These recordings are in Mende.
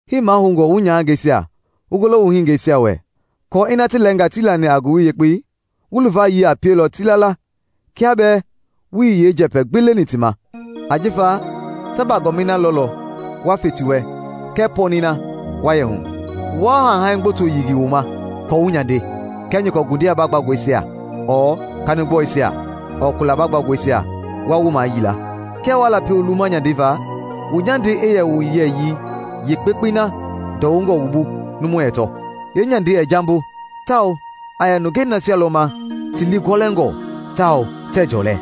Hii mahoungɔ wu nyahangeisia wu golo wu hiningeisia wɛ aako ina ti lɛɛnga tii lani a Ngowili Yekpei, wu luvayii a pielɔ ti la la kiaa bɛɛ wuii yeenjɛpɛ gbi leni ti ma, ajifa ta bagɔɔmɛi na lɔlɔ wa fe ti wɛ kɛɛ pɔɔnɛi na wa yɛ hu. Waa hanihani gboto yilingili wu ma aako wu nyande, kia nyɔkɔ ngundia baagbangɔisia ɔɔ kanigbɔluisia ɔɔ kula baagbangɔisia wa wu mayili la. Kia waa lapi wu luwuma nyandei va, wu nyandei i yɛ a wu yɛyii yeekpekpei na ndɔwungɔ wu bu numu ɛɛ tɔ. Yeenyandei ɛɛ jambo tawao a yɛ nungei nasia lɔ ma ti lii gɔlɛngɔ tawao tɛɛ jɔlɛ.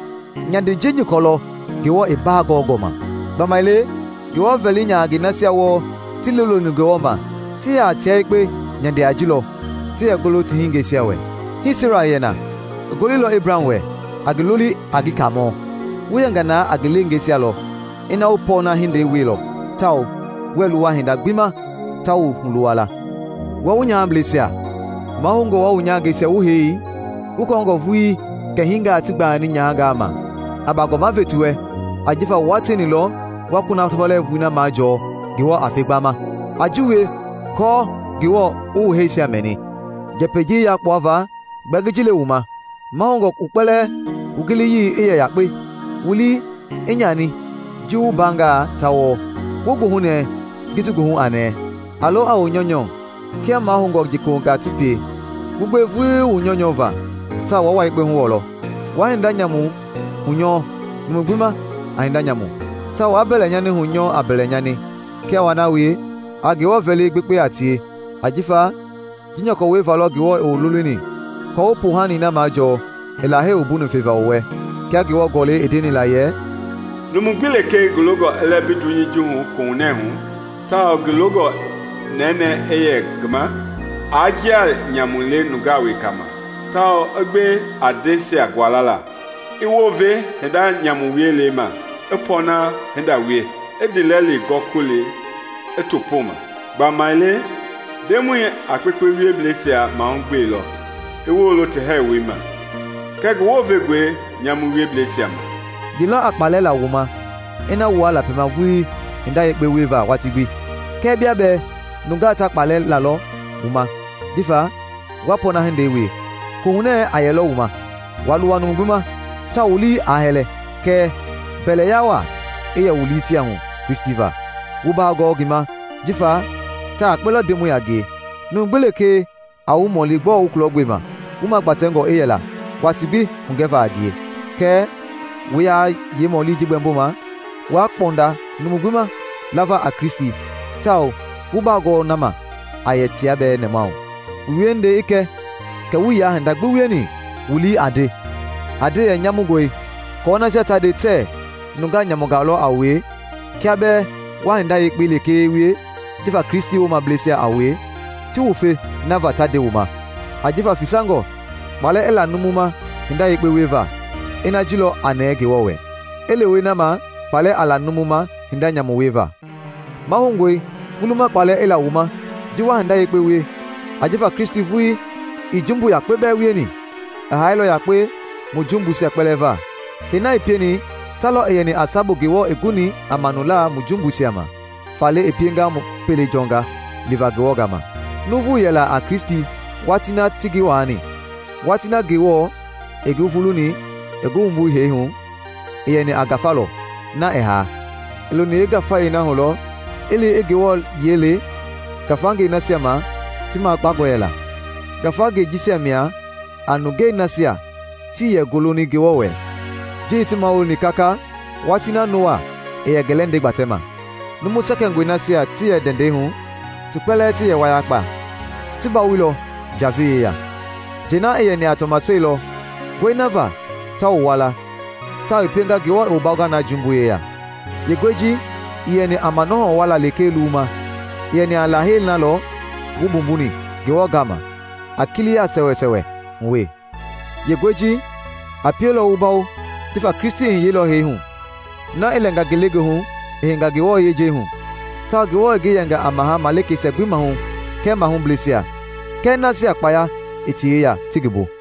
Nyandei ji nyɔkɔ lɔ Ngewɔ i baa gɔɔngɔ ma. Gbamaile Ngewɔ vɛli nyahangɛi nasia wɔɔ ti liiloni Ngewɔ ma, ti yɛ a tia yekpe nyande a ji lɔ ti yɛ golo ti hiningɛisia wɛ. Hii Sera i yɛ na; i goloilɔ Ebraham wɛ, a ngi loli a ngi Kaamɔ. Wu yɛnga na a ngi leengeisia lɔ ina wu pɔɔna hindei wieilɔ tawao wuɛɛ luwa hinda gbi ma ta wu huluwa la. Wua wu nyahableisia, mahoungɔ wua wu nyahangeisia wu hei wu kɔɔngɔ vuli kɛ hingaa ti gbayani nyahangaa ma. A baagɔma ve ti wɛ ajifa wua tieni lɔ wa kunafɔ lɛɛvui na majɔɔ Ngewɔ a fe gbama. A ji wie aako Ngewɔ i wu hɛisia mɛni. Njɛpɛi ji yakpuava gbɛɛ ngi ji le wu ma: mahoungɔ wu kpɛlɛɛ wu giliyii i yɛ yakpe, wu lii i nyani ji wu mbaangaa ta wɔɔ, wu goohunɛɛ ji ti goohu a nɛɛ; a lo a wu nyɔunyɔ kia mahoungɔ njekohungaa ti pie, wu gbewe vulii wu nyɔunyɔ va tawao waa wua yekpe huwɔlɔ. Waa hinda nyamu hunyɔɔ numu gbi ma a hinda nyamu, tawao waa mbɛlɛnyani hunyɔɔ a mbɛlɛnyani; kia waa na wie, a Ngewɔ vɛli i gbekpe a tie, ajifa ji nyɔkɔ wieva lɔ Ngewɔ i wu lolini aako wu poohani na majɔɔ i Lahei wumbuni feva wu wɛ. Kia Ngewɔ Gɔlɛi i ndeni la yɛ, “Numu gbi lekee ngi longɔ i lɛmbi dunyei hu koohunɛ hu, tawao ngi longɔ nɛnɛɛ i lɛ ngi ma, aa njia nyamu le nungaa wekangaa ma tawao i gbe a ndɛisia gualala; i wounve hinda nyamu wiela ma i pɔɔna hinda wie; i ndiilɛli gɔkɔli i to pooma. Gbamaile Ndemɔi a kpekpe wieblɛisia mahugbelɔ i woolo ti hɛɛwoi ma; kɛɛ ngi wounvengɔe nyamu wieblɛisia ma.” Ye lɔ a kpaalɛ la wu ma ina wuaa lapima vulii hinda yekpe wieva watii gbi? Kɛɛ kia bɛɛ nungaa ta kpaalɛ lalɔ wu ma jifa wa pɔɔna hindei wie, koohunɛɛ a yɛlɔ wu ma. Waa luwa numu gbi ma, tawao wu lii aa hɛlɛ. Kɛɛ mbɛlɛya waa i yɛ wu liisia hu Kristi va, wu baagɔɔ ngi ma jifa ta yakpe lɔ Ndemɔi a ngie. Numu gbi lekee a wu mɔli gbɔɔ wu kulɔgbema, wu magbatɛngɔ i yɛla watii gbi hugɛva a ngie. Kɛɛ wu yaa yeemɔli gbɛmboma waa kpɔnda numu gbi ma lava a Kristi tawao wu bagɔɔ na ma a yɛ tia bɛɛ nɛmahu. Wu wiehindei i kɛ kɛ wuii yaa hinda gbi wieni wu lii aa nde yɛ nyamungɔe aako nasia ta nde tɛɛ nungaa nyamungaa lɔ a wue kia bɛɛ wa hinda yekpe lekee wie jifa Kristi woomablɛisia a wue, ti wufe na va ta nde wu ma. Ajifa fesangɔ kpaalɛ i la numu ma hinda yekpe wieva, ina ji lɔ a nɛɛ Ngewɔ wɛ, i lewe na ma kpaalɛ a la numu ma hinda nyamu wieva. Mahoungɔe wu luma kpaalɛ i la wu ma ji wa hinda yekpe wie, ajifa Kristi vulii, ii jumbu yakpe bɛɛ wieni, i haailɔ yakpe mu jumbuisia kpɛlɛɛ va. Hee na i pieni ta lɔ i yɛni a sabu Ngewɔ i guni a manula mu jumbuisia ma, faale i pienga mu pele jɔnga livaa Ngewɔ gaama. Nuuvu yɛla a Kristi watii na ti ngi waani; watii na Ngewɔ i ngi vuluni i ngi wumbu hee hu, i yɛni a ngafa lɔ, na ɛɛ haa, i loni yeengafayei hu lɔ i li i Ngewɔ yiɛi le ngafangei nasia ma ti makpangɔ yɛla. Ngafangei jisia mia a nungei nasia tii yɛ goloni Ngewɔ wɛ ji i ti mawuloni kaka watii na Noa i yɛ ngi lɛndɛi gbatɛma. Numu sɛkɛngɔi nasia ti yɛ ndɛndɛi hu, ti kpɛlɛɛ ti yɛ wayakpa, ti bawoilɔ njavei yeya. Njɛi na i yɛni a tɔmaseli lɔ nguɛi na va ta wu wua la tawao i pienga Ngewɔ i wu bawonga na jumbui yeya. Yeenguɛi ji ii yɛni a manɔhɔ wuala lekee luwuma, i yɛni a Lahei na lɔ wu mbumbuni Ngewɔ gama a kiliya sɛwɛsɛwɛ hu we. Yeenguɛi ji a pielɔ wu bawo jifa Kristi i hiyeilɔ hee hu; na i lɛnga ngelegoohu i heinga Ngewɔ yejei hu, tawao Ngewɔ i ngi yɛnga a Maha malikeisia gbi maahu kɛɛ mahubleisia, kɛɛ nasia kpaya i ti yeya ti ngi bu.